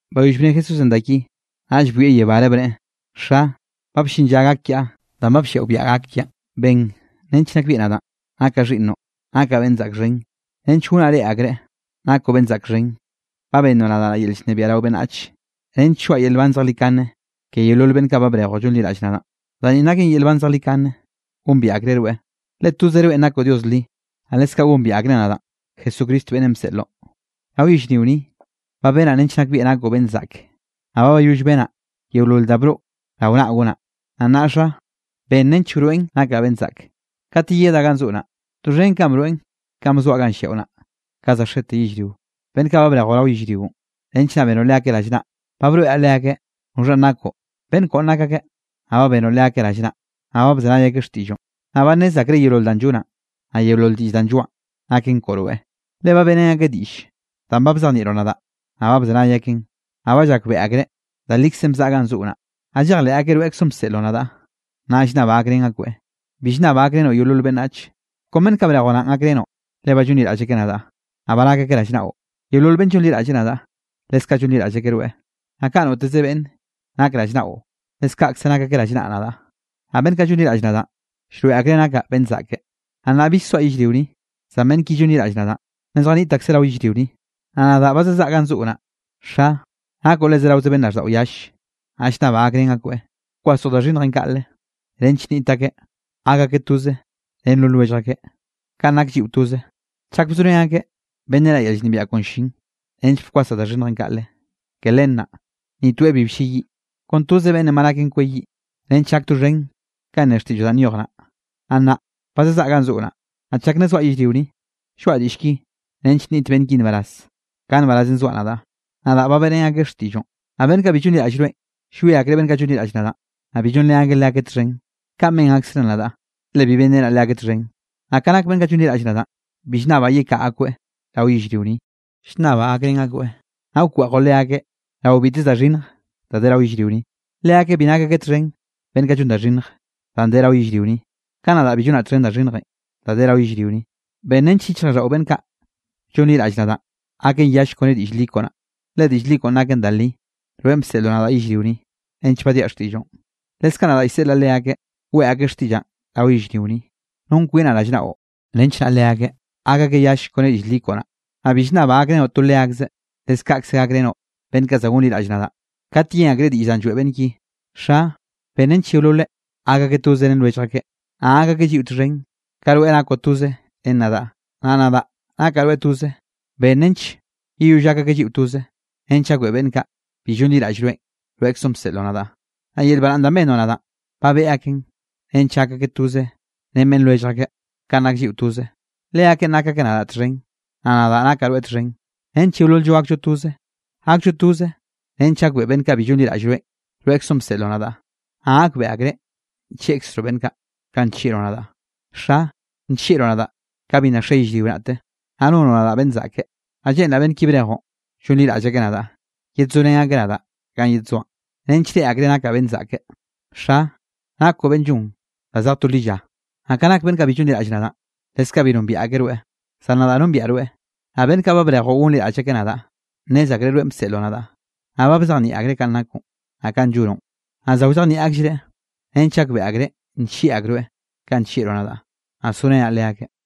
Bayoll bne Jesúsenꞌ da ki, naꞌll bwieꞌ yebáre bneꞌe: —Xa, ba bllin lla gak kiaꞌ, danꞌ ba blliaꞌo biaꞌa gak kiaꞌn. Ben nench nakbieꞌ nadaꞌn, nakaꞌ xhiꞌnnoꞌ, nakaꞌ beꞌnn zaꞌk xhen, nench gonaꞌ reꞌe akreꞌ, nakoꞌ beꞌnn zaꞌk xhen. Ba bennoꞌ nadaꞌ yel llnebiaꞌ rao beꞌnnach, nench lloaꞌa yel nban zejlikane ke yeolol beꞌnn kaꞌ ba brejoꞌ llonliraꞌll nadaꞌn. Da ni naken yel nban zejlikane: gombiaꞌ akreꞌ rweꞌ, le tozoꞌ rweꞌn nakoꞌ Dios li, naꞌ leskaꞌ gombiaꞌ akreꞌ nadaꞌn, Jesucristo, beꞌnnenꞌ bseꞌloꞌ. ’Rao yellrio ni, ba benaꞌ nench nakbieꞌ nakoꞌ beꞌnn zaꞌk, naꞌ ba bayoll benaꞌ yeolol da broꞌ rao naꞌ gonaꞌ. Naꞌ nnaꞌ Xa, ben nench naꞌ wroeꞌn nakaꞌ beꞌnn zaꞌk, kat yeyedaꞌ gan zoꞌo naꞌ, doxhen kanꞌ broeꞌn kanꞌ bzoaꞌ ganꞌ lliaꞌo naꞌ, kanꞌ za xete yellrio. ’Beꞌnn kaꞌ ba brejoꞌ rao yellrionꞌ, nench naꞌ benoꞌ leakeꞌ rallnaꞌ, ba broeꞌraꞌ leakeꞌ noxhanꞌ nakoꞌ. Beꞌnn koꞌon nak akeꞌ, naꞌ ba benoꞌ leakeꞌ rallnaꞌ, naꞌ ba bzenay akeꞌ xtiꞌlloꞌn. Naꞌ ba nnez akreꞌ yeolol danꞌ llonaꞌ, naꞌ yeolol diꞌll danꞌ lloaꞌan, naken koꞌo rweꞌ. Le ba beꞌrén akeꞌ diꞌll danꞌ ba bzejnieꞌroꞌ nadaꞌ, naꞌ ba bzenay akeꞌn, naꞌ ba llakbeꞌe akreꞌ, da likzenꞌ bzaꞌa ganꞌ zoꞌo naꞌ, naꞌ llejleꞌ akeꞌ rweꞌkzoꞌn bseꞌloꞌ nadaꞌ. ’Naꞌ llnnabaꞌ gakrén akoeꞌ. Bi llnnabaꞌ gakrenoꞌ yeolol beꞌnnach, kon beꞌnn kaꞌ ba brejoꞌ naꞌn, gakrenoꞌ le ba llonliraꞌll akeꞌ nadaꞌ, naꞌ ba nak akeꞌ rallnaꞌo. Naꞌ yeolol beꞌnn llonliraꞌlle nadaꞌ, leskaꞌ llonliraꞌll akeꞌ rweꞌ. Naꞌ kaꞌ noteze beꞌnne nak rallnaꞌo, leskaꞌkze nak akeꞌ rallnaꞌ nadaꞌ, naꞌ beꞌnn kaꞌ llonliraꞌll nadaꞌn, llroeꞌ akreꞌ nakaꞌ beꞌnn zaꞌke. ’Naꞌ nnaꞌ bill soaꞌ yellrio ni, zan beꞌnn ki llonliraꞌll nadaꞌn, nna zjaniꞌt akseꞌ rao yellrio ni, naꞌ nadaꞌ ba zazaꞌa ganꞌ zoꞌo naꞌ. Xa, nakoꞌ le zeraoze beꞌnn raꞌlldaꞌo yalle, naꞌ llnnabaꞌ gakrén akoeꞌ, wkwasoꞌ da xhinnjenꞌ kaꞌle, nench nniꞌt akeꞌ gak akeꞌ toze ren no lwellj akeꞌ, kanꞌ nak lliꞌo toze. Chak bzorén akeꞌ, benrenaꞌ yel llnebiaꞌ koꞌon llin, nench bkwasaꞌ da xhinnjenꞌ kaꞌle. Ke len naꞌ, ni toeꞌ bi blleyiꞌ, kon toze beꞌnne ba naken kweyiꞌ, nench gak doxhen kanꞌ ne xtiꞌlloꞌ danꞌ nyoj naꞌ. ’Naꞌ nnaꞌ ba zazaꞌa ganꞌ zoꞌo naꞌ, naꞌ chak nna zoaꞌ yellrio ni, lloaꞌa diꞌll ki nench nniꞌt beꞌnn ki nbaraz, ka nbarazenꞌ zoaꞌ nadaꞌ. Nadaꞌ ba beꞌrén akeꞌ xtiꞌlloꞌn. Naꞌ beꞌnn kaꞌ bi llonliraꞌll rweꞌn, llwie akreꞌ beꞌnn kaꞌ llonliraꞌll nadaꞌn, danꞌ bi llonrén akeꞌ leakeꞌ txhen, kaꞌn ben akzreꞌ nadaꞌ, le bi benrenaꞌ leakeꞌ txhen. Naꞌ ka nak beꞌnn kaꞌ llonliraꞌll nadaꞌn, bi llnnabaꞌ yekaꞌa akoeꞌ rao yellrio ni, llnnabaꞌ gakrén akoeꞌ naꞌ wkweꞌjoꞌ leakeꞌ rao biteze da xhinnj da de rao yellrio ni. Leakeꞌ bi nak akeꞌ txhen beꞌnn kaꞌ llon da xhinnj, danꞌ de rao yellrio ni, ka nadaꞌ bi llonaꞌ txhen da xhinnjenꞌ, da de rao yellrio ni. Ben nench yichjraꞌlldaꞌo beꞌnn kaꞌ llonliraꞌll nadaꞌ, gaken yall kone diꞌll li koꞌo naꞌ. Le diꞌll koꞌon naken da li. Rweꞌn bseꞌloꞌ nadaꞌ yellrio ni, nench baddiaꞌ xtiꞌlloꞌn, leskaꞌ nadaꞌ llseꞌlaꞌ leakeꞌ, weꞌe akeꞌ xtiꞌllaꞌn rao yellrio ni. Non kwinaꞌ rallnaꞌo, nench naꞌ leakeꞌ gak akeꞌ yall kone diꞌll li koꞌo naꞌ. ’Naꞌ bi llnnabaꞌ gakrenoꞌ to leakzeꞌ, leskaꞌkze gakrenoꞌ beꞌnn kaꞌ za gonliraꞌll nadaꞌ, kat yen akreꞌ diꞌll danꞌ lloeꞌ beꞌnn ki. Xa, ben nench yeololeꞌ gak akeꞌ toze ren lwellj akeꞌ, naꞌ gak akeꞌ lliꞌo txhen, ka rweꞌ nakoꞌ toze ren nadaꞌ, naꞌ nadaꞌ nakaꞌ rweꞌ toze. Ben nench yeyoll gak akeꞌ lliꞌo toze, nench gakbeꞌe beꞌnn kaꞌ bi llonliraꞌll rweꞌn, rweꞌkzoꞌn bseꞌloꞌ nadaꞌ. Naꞌ yel baraꞌnn danꞌ bennoꞌ nadaꞌ, ba beꞌe akeꞌn nench nak akeꞌ toze ren beꞌnn lwellj akeꞌ, kanꞌ nak lliꞌo toze. Leakeꞌn nak akeꞌ nadaꞌ txhen, naꞌ nadaꞌ nakaꞌ rweꞌ txhen, nench yeolol-llo gakllo toze. Gakllo toze nench gakbeꞌe beꞌnn kaꞌ bi llonliraꞌll rweꞌn, rweꞌkzoꞌn bseꞌloꞌ nadaꞌ, naꞌ gakbeꞌe akreꞌ nllieꞌkzroꞌ beꞌnn kaꞌ, kanꞌ nllieꞌroꞌ nadaꞌ. ’Xa, nllieꞌroꞌ nadaꞌ ka bi nna xe yellrio naꞌte, naꞌ nonoꞌ nadaꞌ beꞌnn zaꞌke. Naꞌ lleꞌnraꞌ beꞌnn ki brejoꞌ, llonliraꞌll akeꞌ nadaꞌ, yedzorén akeꞌ nadaꞌ ganꞌ yedzoaꞌn, nench reꞌe akreꞌ nakaꞌ beꞌnn zaꞌke. Xa, nakoꞌ beꞌnn llon da zej to lilla. Naꞌ ka nak beꞌnn kaꞌ bi llonliraꞌll nadaꞌn, leskaꞌ bi nombiaꞌ akeꞌ rweꞌ, zan nadaꞌ nombiaꞌ rweꞌ, naꞌ beꞌnn kaꞌ ba brejoꞌ gonliraꞌll akeꞌ nadaꞌ, nnez akreꞌ rweꞌn bseꞌloꞌ nadaꞌ. Naꞌ ba bzejnieꞌ akreꞌ kanꞌ nakoꞌn, naꞌ kanꞌ llonoꞌ, naꞌ za wzejnieꞌ akllereꞌ, nench gakbeꞌe akreꞌ nllieꞌ akroeꞌ kanꞌ nllieꞌroꞌ nadaꞌ, naꞌ sorenaꞌ leakeꞌ.